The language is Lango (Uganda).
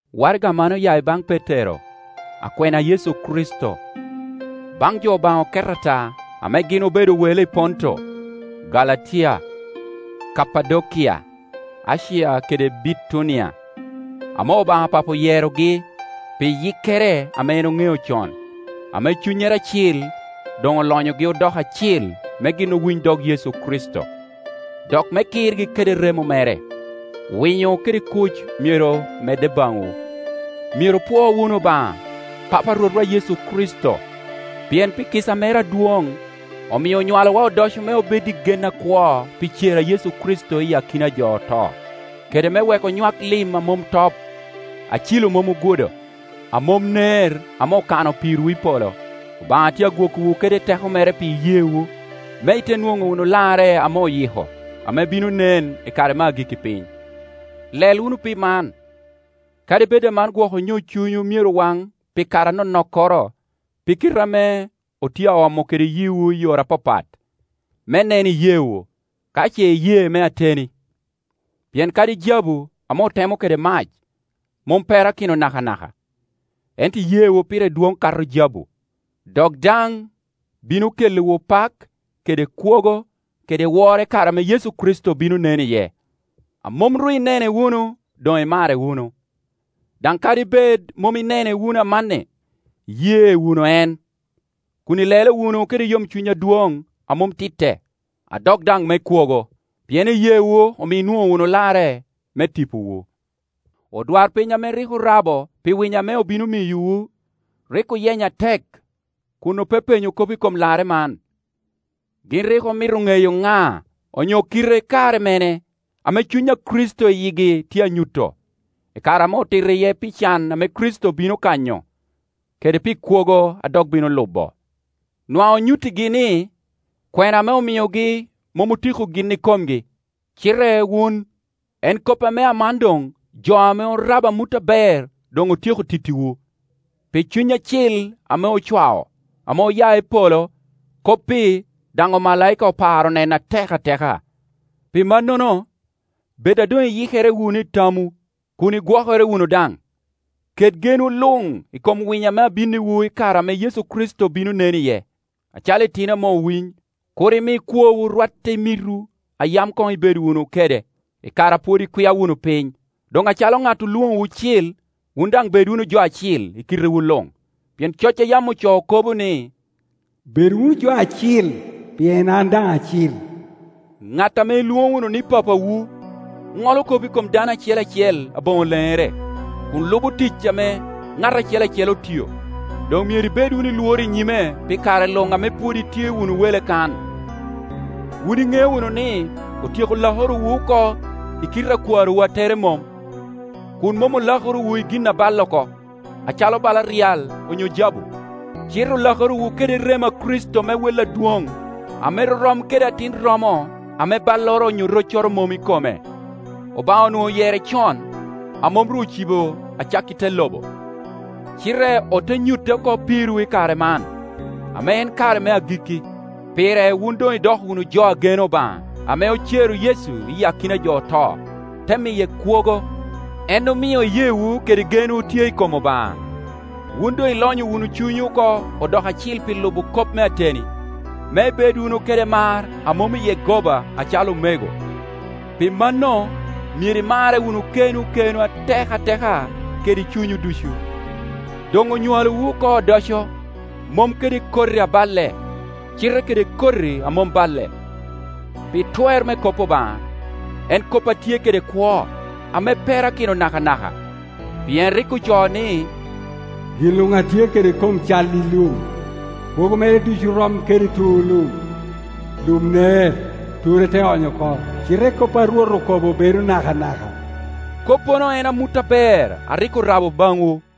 Waraga man oya i baŋ Petero, akwena a Yecu Kricito. Baŋ jo Obaŋa oket ata, ame gin obedo wele i Ponto, Galatia, Kapadokia, Acia kede Bitunia, ame Obaŋa Papo oyerogi pi yikkere ame en oŋeo con, ame Cunnyere Acil doŋ olonyogi odoko acil me gin owiny dog Yecu Kricito, dok me kirgi kede remo mere: Winyo kede kuc myero medde baŋwu. Myero opwo wunu Obaŋa, Papa a Rwotwa Yecu Kricito! Pien pi kica mere adwoŋ, omio onywalowa odoco me obed i gen akwo pi cer a Yecu Kricito iyi akina a jo oto, kede me wek onywak lim a mom top, a cilo mom ogudo, a mom ner ame okano pirwu i polo. Obaŋa tye agwokowu kede teko mere pi iyeewu, me ite nwoŋo wunu larre ame oyiko, ame bino nen i kare me agikki piny. Lel wunu pi man, kadi bed aman gwok onyo cunywu myero waŋ pi kare anonokkoro pi kite ame otye a omo kede yiwu i yore apapat, me nen iyeewu, ka ce iyee me ateni, Pien kadi jabu ame otemo kede mac mom perakino nakanaka, ento iyeewu pire dwoŋ kato jabu, dok daŋ bino kelliwu pak kede kwogo kede woro i kare ame Yecu Kricito bino nen iye. A mom ru inene wunu, doŋ imare wunu. Daŋ kadi bed mom inene wunu amanni, iye wunu en, kun ilelo wunu kede yomcuny adwoŋ a mom titte, a dok daŋ me kwogo. Pien iyeewu omio inwoŋo wunu larre me tipowu. Odwarpiny ame rik orabo pi winyo ame obino miyowu, rik oyenyo atek, kun opepenyo kop i kom larre man. Gin rik omito ŋeyo ŋa, onyo kit kare mene, ame Cuny a Kricito i yigi tye a nyuto, i kare ame otito iye pi can ame Kricito bino kanyo, kede pi kwogo a dok bino lubo. Nwaŋ onyuttigi ni, kwena ame omiogi mom otiko gin ikomgi, cite wun. En kop ame aman doŋ jo ame orabo amut aber doŋ otyeko tittiwu, pi Cuny Acil ame ocwao, ame oya i polo; kop-pi daŋ omalaika oparo neno atek ateka. Pi mannono, bed a doŋ iyikere wunu i tamwu, kun igwokere wunu daŋ. Ket genwu luŋ i kom winyo ame abinniwu i kare ame Yecu Kricito bino nen iye. Acalo itino ame owiny, kur imi kwowu rwatte i mitwu a yam koŋ ibedo wunu kede, i kare a pwod ikwia wunu piny. Doŋ acalo ŋat olwoŋowu cil, wun daŋ bed wunu jo acil i kitewu luŋ; pien coc a yam ocoo kobo ni, “Bedo wunu jo acil, pien an daŋ acil.” Gat ame ilwoŋo wunu ni Papawu ŋolo kop i kom dano acel acel aboŋo leŋere, kun lubo tic ame ŋat acel acel otio; doŋ myero ibed wunu i Iworo i nyime pi kare luŋ ame pwod itye wunu wele kan. Wun iŋeo wunu ni, otyeko lakorowu oko i kite a kwarowu a tere mom, kun mom olakorowu i gin a balle oko, acalo bala ryal onyo jabu, cite olakorowu kede remo a Kricito me wel adwoŋ ame rorom kede atin romo ame balloro onyo roccoro mom i kome. Obaŋa onwoŋo oyere con, amom ru ocibo acakki te lobo, cite ote nyute oko pirwu i kare man, ame en kare me agikki. Pire wun doŋ idoko wunu jo a geno Obaŋa ame ocero Yecu i akina a jo oto, te miye kwogo; en omio iyeewu kede genwu tye i kom Obaŋa. Wun doŋ ilonyo wunu cunywu oko odoko acil pi lubo kop me ateni, me ibed wunu kede mar a mom iye goba acalo omego; pi mano myero imarre wunu kenwu kenwu atek ateka kede cunywu ducu. Doŋ onywalowu oko odoco, mom kede koti aballe, cite kede koti a mom balle, pi twer me kop Obaŋa, en kop a tye kede kwo, ame perakino nakanaka; pien rik ocoo ni, “Gin luŋ a tye kede kom cal i lum, kwogo mere ducu rom kede tur lum. Lum ner, ture te ony oko, cite kop a Rwot okobo bedo nakanaka,” Koppono en amut aber a rik orabo baŋwu.